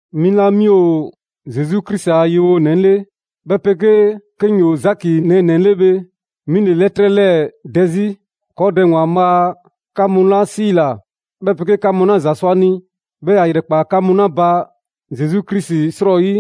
'Mi 'la 'mi ‑o Zesu Krisi a yewonɛ 'le, 'bhɛ 'pegee 'ke 'ŋ 'yoo‑ Zaki nɛɛnɛ‑ 'le bhe, 'mi ‑le 'lɛtrɛ 'lɛɛ‑ dɛ 'zi. ‑Kɔɔ' Dɛ ‑Waanbhaa' 'ka mu 'la 'siila‑, 'bhɛ 'pegee 'ka mu 'la ‑za sɔ a ni, 'bhɛɛ‑ ‑ya ‑yrɛkpa' 'ka mu 'la ba Zesu Krisi 'srɔyi,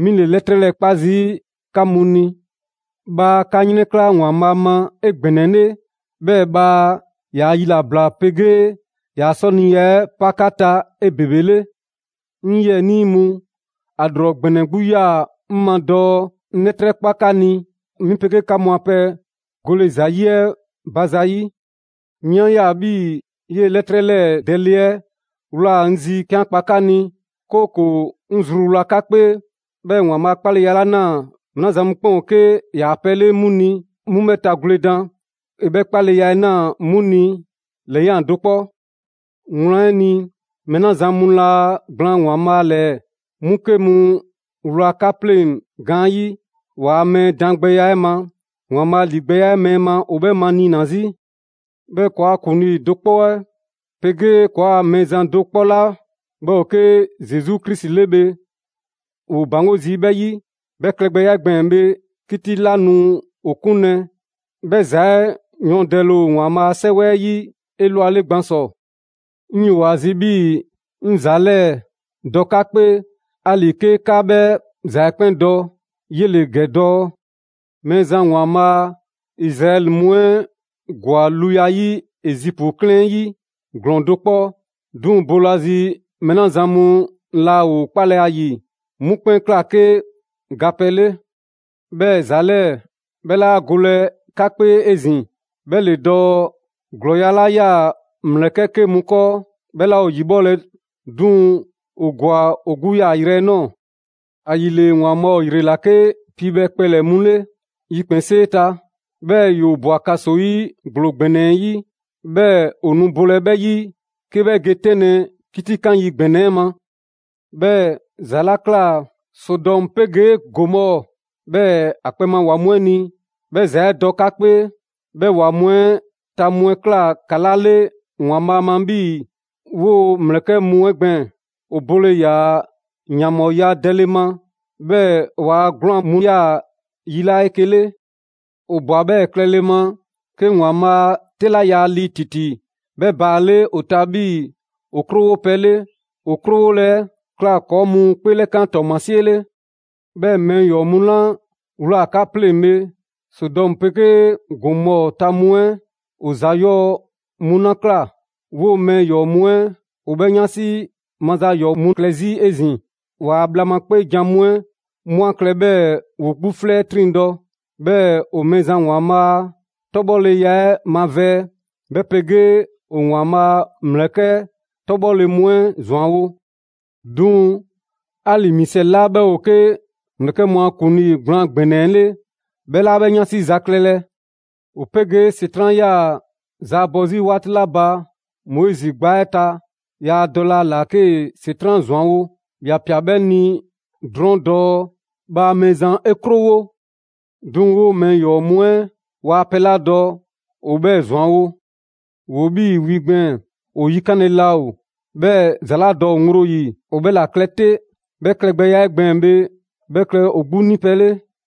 'mi ‑le 'lɛtrɛ 'lɛɛ‑ 'kpa zii' 'ka mu ni. Bhaa 'ka 'yrɛnkla‑ ‑Waanbhaa' ma 'egbɛnɛle, 'bhɛɛ‑ bhaa ‑yaa' yilabla 'pegee ‑yaa' 'sɔniya 'ɛ 'pa 'ka ta 'ebebele. 'Ŋ 'yiɛnii mu, ‑a ‑lrɔ ‑gbɛnɛ 'gbu 'yaa‑ 'ŋ ma dɔɔ 'ŋ 'lɛtrɛ 'kpa 'ka ni 'mi 'pegee 'ka mu a pɛ gole ‑za 'yi 'ɛ ba zayi'. 'Mi 'a ꞊ya 'bhii‑ 'yee‑ 'lɛtrɛ 'lɛɛ‑ dɛlɛ 'ɛ ꞊wlaa 'ŋ zi 'ke 'an kpa ni, 'kooko‑ 'ŋ zruwla 'ka 'kpee, 'bhɛɛ‑ ‑Waanbhaa' 'kpaleya 'la ꞊naa mɛɛ 'la zan mu 'kpɛn ‑o 'ke ‑yaa' pɛ 'le 'mu ni, 'mu 'bhɛ tagwledan. ‑E 'bhɛ 'kpaleya 'ɛ ꞊naa 'mu ni ‑lɛyan' do 'kpɔ. Wlan 'ɛ ni, mɛɛ 'la zan mu laa gblaan ‑Waanbhaa' ‑lɛɛ, 'mu 'ke mu ‑wlaa 'ka 'pleŋ‑ gaanyi'. Waa mɛɛ daangbɛya 'ɛ ma, ‑Waanbhaa' ‑ligbɛya 'ɛ mɛɛ ma ‑o 'bhɛ maniina 'zi. 'Bhɛɛ‑ ‑kɔɔa' ‑Kuŋlii do 'kpɔ 'ɛ 'pegee ‑kɔɔa' Mɛɛzan do 'kpɔ 'la 'bhɛ ‑o 'ke Zesu Krisi 'le bhe, ‑woo ‑baŋgo' zii' 'bhɛ 'yi. 'Bhɛ klɛgbɛya 'ɛ gbɛɛn‑ bhe, 'kiti 'la nu ‑o 'kunlɛ‑, 'bhɛ ‑za 'ɛ yɔɔndɛle ‑o ‑Waanbhaa' a 'Sɛwɛ 'ɛ 'yi 'elwale gban ‑sɔ. 'Ŋ 'yoo‑ ‑a zi 'bhii‑ 'ŋ ‑za 'lɛɛ‑ dɔ 'ka 'kpee, 'ali‑ 'ke 'ka 'bhɛ ‑za 'ɛ 'kpɛn dɔ, 'yele‑ ‑gɛ dɔɔ: Mɛɛzan ‑Waanbhaa' Izraɛli mu 'ɛ ‑gwa luya 'yi Ezipu 'klɛɛn 'ɛ 'yi ‑glɔɔn do 'kpɔ, 'duŋ‑ boolazi, mɛɛ 'la zan mu laa ‑o 'kpalɛ‑ ‑a ‑yi, 'mu 'kpɛn ꞊kla 'ke gapɛ 'le. 'Bhɛɛ‑ ‑za 'lɛɛ‑ 'bhɛ 'laa golɛ 'ka 'kpee 'ezin‑, 'bhɛ ‑le dɔɔ: ‑glɔɔya' 'la 'yaa‑ ‑mlɛkɛ' 'ke mu 'kɔɔ, 'bhɛ 'laa ‑o ‑yibhɔlɛ, 'duŋ‑ ‑o ‑gwa ‑o 'gbu yaayrɛ 'ɛ ꞊nɔɔ. ‑Ayile ‑Waanbhaa' ‑o ‑yrela 'ke piibhɛ kpɛlɛ‑ mu 'le yikpɛnsee ta. 'Bhɛɛ‑ ‑yoo ꞊bwa ‑kaso 'yi ‑gblo ‑gbɛnɛ 'ɛ 'yi, 'bhɛɛ‑ ‑o nu bolɛ 'bhɛ 'yi 'ke 'bhɛ ge 'tɛnlɛ‑ 'kitikan yi ‑gbɛnɛ 'ɛ ma. 'Bhɛɛ‑ ‑za 'la ꞊kla Sodɔmu 'pegee Gomɔɔ, 'bhɛɛ‑ ‑o kpɛ ma ‑wa mu 'ɛ ni, 'bhɛ ‑za 'ɛ dɔ 'ka 'kpee. 'Bhɛ ‑wa mu 'ɛ ta mu 'ɛ ꞊kla ‑kala' 'le ‑Waanbhaa' ma 'bhii‑ 'woo‑ ‑mlɛkɛ' mu 'ɛ gbɛɛn‑: ‑o bole ‑yaa ‑yanbhɔɔya dɛle ma, 'bhɛɛ‑ ‑waa 'gwlaan‑ mu 'yaa‑ yilaa' 'eke‑ 'le. ‑O ꞊bwa 'bhɛɛ‑ klɛle ma 'ke ‑Waanbhaa' a 'tɛ 'la yaa lii ‑titi 'bhɛ baale' ‑o ta 'bhii‑ ‑o 'krowopɛ 'le. ‑O 'krowole 'ɛ ꞊kla ‑kɔɔ' mu 'kpeelɛkan ‑tɔɔmasie 'le. 'Bhɛɛ‑ mɛɛ ‑yɔɔ' mu 'la ꞊wlaa 'ka 'pleŋ‑ bhe, Sodɔmu 'pegee Gomɔɔ ta mu 'ɛ ‑o ‑za 'yɔɔ‑ mu 'la ꞊kla, 'woo‑ mɛɛ ‑yɔɔ' mu 'ɛ ‑o 'bhɛɛ‑ 'yansi ma ‑za ‑yɔɔ' mu klɛ 'zi 'ezin‑. ‑Waa' bhla ma 'kpeejan‑ mu 'ɛ 'mu 'a klɛ 'bhɛɛ‑ ‑woo 'gbu 'flɛ 'ɛ 'triŋdɔ‑. 'Bhɛɛ‑ ‑o Mɛɛzan ‑Waanbhaa' a 'tɔbhɔleya 'ɛ mavɛɛ, 'bhɛ 'pegee ‑o ‑Waanbhaa' a ‑mlɛkɛ' 'tɔbhɔle mu 'ɛ ‑zwanwo'. 'Duŋ‑ 'ali‑ Misɛli 'la 'bhɛ ‑o 'ke ‑mlɛkɛ' mu a ‑kuŋlii gblaan ‑gbɛnɛ 'ɛ 'le, 'bhɛ 'laa 'bhɛ 'yansi za klɛlɛ. ‑O 'pegee ‑Setran' 'yaa‑ zaabɔ 'zi 'waati 'la ba Moizi gbaa 'ɛ ta, yaa dɔlɛ ‑a ‑la 'kee‑ ‑Setran' ‑zwanwo'. ‑Ya ꞊pia 'bhɛ ni drɔɔn' dɔɔ: «Bhaa Mɛɛzan 'e 'krowo!» 'Duŋ‑ 'woo‑ mɛɛ ‑yɔɔ' mu 'ɛ waa pɛ 'la dɔ, ‑o 'bhɛɛ‑ ‑zwanwo'. ‑Woo 'bhii‑ wi gbɛɛn‑, ‑o 'yikanle laa ‑o, 'bhɛɛ‑ ‑za 'la dɔ ‑o ŋgblo 'yi, ‑o 'bhɛ ‑la klɛ 'te. 'Bhɛ klɛgbɛya 'ɛ gbɛɛn‑ bhe, 'bhɛ klɛ ‑o 'gbu 'nipɛ‑ 'le.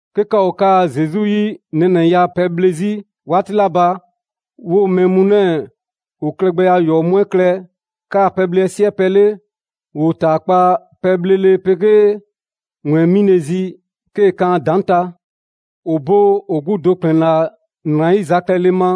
'Ke 'ka ‑o 'kaa‑ Zesu 'yi nɛɛnɛya pɛ 'ɛ 'bhle zii' 'waati 'la ba, 'woo‑ mɛɛ mu 'lɛɛ‑, ‑o klɛgbɛya ‑yɔɔ' mu 'ɛ klɛ 'kaa‑ pɛbhle 'ɛ 'siɛpɛ‑ 'le. ‑Woo ‑taakpa' pɛbhlele 'pegee ‑wɛɛn 'mile‑ zi 'kee‑ kan ‑a ‑daŋ' ta. ‑O bo 'o 'gbu do ‑kplɛn ‑la ‑nrayiza klɛle ma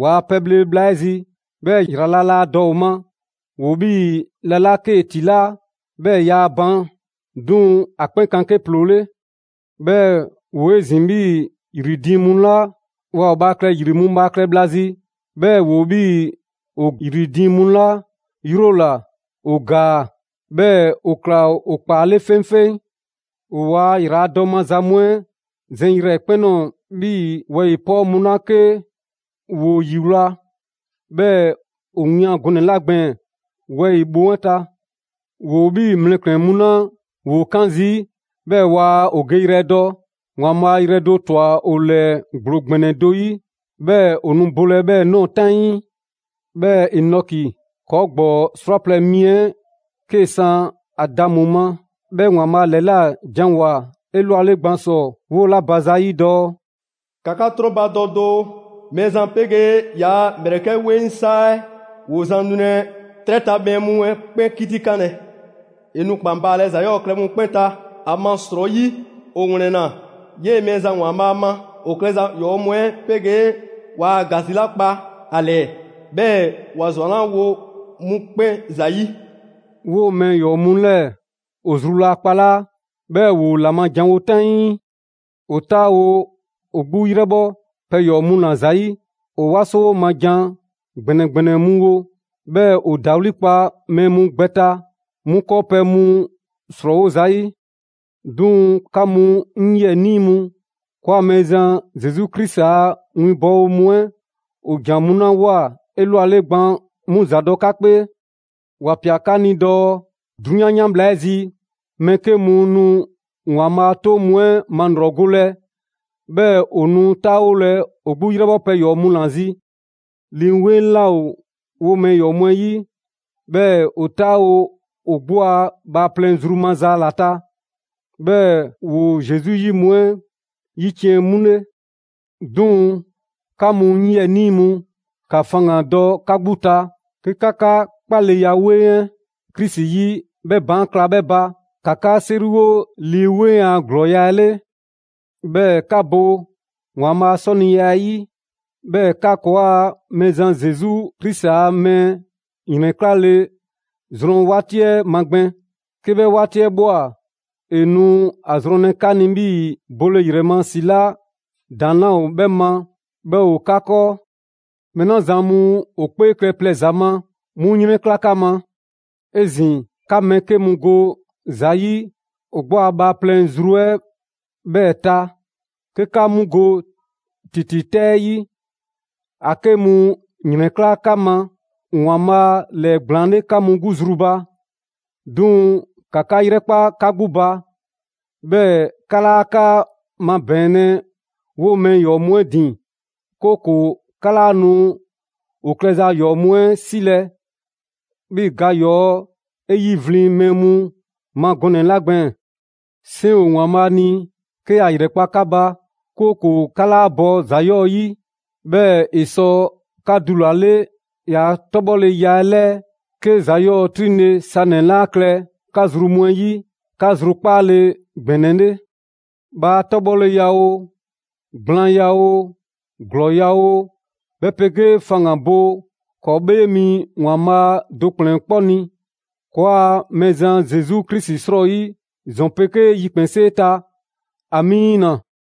‑waa' pɛbhle bhla 'ɛ zi, 'bhɛɛ‑ ‑yrala' laa dɔ ‑o ma. ‑Woo 'bhii‑ la 'la 'kee‑ ‑tilaa', 'bhɛɛ‑ yaa ban, 'duŋ‑ ‑a 'kpɛn kan 'ke ‑ploo 'le. 'Bhɛɛ‑ ‑woo 'ezin‑ 'bhii‑ ‑yri diiŋ mu 'la waa ‑o bhaa klɛ ‑yri mu bhaa klɛ bhla zi, 'bhɛɛ‑ ‑woo 'bhii‑ ‑o ‑yri diiŋ mu 'la 'yrola‑, ‑o ‑gaa, 'bhɛɛ‑ ‑o ꞊kla ‑o ‑kpaa 'le 'feŋfeŋ. ‑O ‑waa' ‑yraladɔ maza mu 'ɛ zɛn yrɛkpɛn‑ ꞊nɔɔ 'bhii‑ wɛyi‑ 'pɔɔ mu 'la 'ke ‑woo ‑yiwlaa, 'bhɛɛ‑ ‑o wian gɔnɛ‑ 'la gbɛɛn‑ wɛyi‑ bhoŋ 'ɛ ta. ‑Woo 'bhii‑ mlɛklɛn‑ mu 'la ‑woo 'kaan zii' 'bhɛɛ‑ waa ‑o geyrɛ dɔ. ‑Waanbhaa' yrɛ do ‑twa ‑o ‑lɛɛ ‑gblo ‑gbɛnɛ do 'yi, 'bhɛɛ‑ ‑o nu bolɛ 'bhɛɛ‑ ꞊nɔɔ 'taŋii. 'Bhɛɛ‑ Enɔki, ‑kɔɔ' ‑gbɔɔ 'srwaplɛ‑ mi 'ɛ 'kee‑ san Adamu ma, 'bhɛ ‑Waanbhaa' ‑lɛla janwoa‑ 'elwale gban ‑sɔ 'wola‑ ba zayi' dɔɔ: «‑Ka 'ka 'trɔnbadɔ doo, Mɛɛzan 'pegee ‑yaa' ‑mlɛkɛ' 'weŋ 'saa 'ɛ, ‑woo zan nulɛ, 'trɛ ta mɛɛ mu 'ɛ 'kpɛn 'kitikanlɛ. ‑E nu ‑kpan baalɛ ‑za 'yɔɔ‑ klɛ mu 'kpɛn ta ‑amasrɔyi ‑o 'wlɛnna 'yee‑ Mɛɛzan ‑Waanbhaa' ma ‑o klɛza ‑yɔɔ' mu 'ɛ 'pegee waa ‑gasi 'la kpa ‑a ‑lɛɛ, 'bhɛɛ‑ ‑wa ‑zwanlawo 'mu 'kpɛn ‑zayi'.» 'Woo‑ mɛɛ ‑yɔɔ' mu 'lɛɛ‑ ‑o zru laa kpalaa', 'bhɛɛ‑ ‑woo ‑la ma janwo 'taŋii. ‑O 'taawo‑ ‑o 'gbu 'yrɛbhɔ pɛ ‑yɔɔ' mu ‑la zi. ‑O 'waso ma jan ‑gbɛnɛ ‑gbɛnɛ mu wo, 'bhɛɛ‑ ‑o ‑dawli' kpa mɛɛ mu gbɛ ta 'mu 'kɔɔpɛ‑ mu 'srɔɔwo zayi'. 'Duŋ‑ 'ka mu 'ŋ 'yiɛnii mu, ‑kɔɔa' Mɛɛzan Zesu Krisi a winbɔwo mu 'ɛ ‑o ‑jan mu 'la 'woa‑ 'elwale gban 'mu ‑za dɔ 'ka 'kpee. ‑Wa ꞊pia 'ka ni dɔɔ: «'Drunyan 'yan bhla 'ɛ zi, mɛɛ 'ke mu nu ‑Waanbhaa ‑a 'toŋ mu 'ɛ malrɔgolɛ, 'bhɛɛ‑ ‑o nu 'taawolɛ ‑o 'gbu 'yrɛbhɔ pɛ ‑yɔɔ' mu ‑la zi.» Lii 'Weŋ 'laa ‑o 'woo‑ mɛɛ ‑yɔɔ' mu 'ɛ 'yi, 'bhɛɛ‑ ‑o 'taawo‑ ‑o 'gbu a bhaaplɛŋ zru maza ‑la ta, 'bhɛɛ‑ ‑woo Zesu 'yi mu 'ɛ ‑yiciɛn' mu 'le. 'Duŋ‑ 'ka mu 'ŋ 'yiɛnii mu, ‑ka faŋgandɔ 'ka 'gbu ta, 'ke 'ka 'ka 'kpaleya 'weŋ 'ɛ Krisi 'yi 'bhɛ baan' kla 'bhɛ ba. ‑Ka 'ka 'seriwo Lii 'Weŋ a ‑glɔɔya' 'ɛ 'le. 'Bhɛɛ‑ ‑ka bo ‑Waanbhaa' a 'sɔniya 'ɛ 'yi. 'Bhɛɛ‑ ‑ka ‑kɔɔa' Mɛɛzan Zesu Krisi a mɛɛ ‑yrɛnklale zrɔn 'waati 'ɛ magbɛn. 'Ke 'bhɛ 'waati 'ɛ ꞊bhwa, ‑e nu a zrɔnlɛ 'ka ni 'bhii‑ bole ‑yrɛ ma ‑si 'la ‑daŋ' 'laa ‑o 'bhɛ ma 'bhɛ ‑o 'ka 'kɔɔ. Mɛɛ 'la zan mu ‑o 'kpee klɛ plɛ ‑za ma, 'mu 'yrɛnkla 'ka ma. 'Ezin‑, ‑ka mɛɛ 'ke mu go ‑za 'yi ‑o 'gbu a bhaaplɛŋ zru 'ɛ 'bhɛɛ‑ ta 'ke 'ka 'mu go 'kiti 'tɛ 'ɛ 'yi. ‑A 'ke mu ‑yrɛnkla' 'ka ma ‑Waanbhaa' ‑lɛɛgblaan 'le 'ka mu 'gbu zru ba. 'Duŋ‑ ‑ka 'ka 'yrɛkpa 'ka 'gbu ba, 'bhɛɛ‑ 'ka 'laa 'ka 'mabɛɛnlɛ 'woo‑ mɛɛ ‑yɔɔ' mu 'ɛ ‑din, 'kooko‑ 'ka 'laa nu ‑o 'klɛza ‑yɔɔ' mu 'ɛ 'silɛ‑ 'bhii‑ ga ‑yɔɔ' 'e 'yivlin‑ mɛɛ mu ma gɔnɛ‑ 'la gbɛɛn‑. 'Seŋ ‑o ‑Waanbhaa' ni 'ke ‑ya ‑yrɛkpa' 'ka ba, 'kooko‑ 'ka 'laa bɔ ‑za 'yɔɔ‑ 'yi. 'Bhɛɛ‑ ‑e sɔ 'ka dulale ‑yaa' 'tɔbhɔleya 'ɛ 'lɛɛ 'ke ‑za 'yɔɔ‑ 'triŋle‑ sanɛ‑ 'laa klɛ 'ka zru mu 'ɛ 'yi, 'ka 'zrukpaale ‑gbɛnɛ 'le. Bhaa 'tɔbhɔleya oo, gblaanya oo, ‑glɔɔya' oo, 'bhɛ 'pegee faŋgan‑ bo ‑kɔɔ' 'Bhee Mi ‑Waanbhaa' do ‑kplɛn 'kpɔ ni, ‑kɔɔa' Mɛɛzan Zesu Krisi 'srɔyi ‑zɔn 'pegee yikpɛnsee ta! Amiina!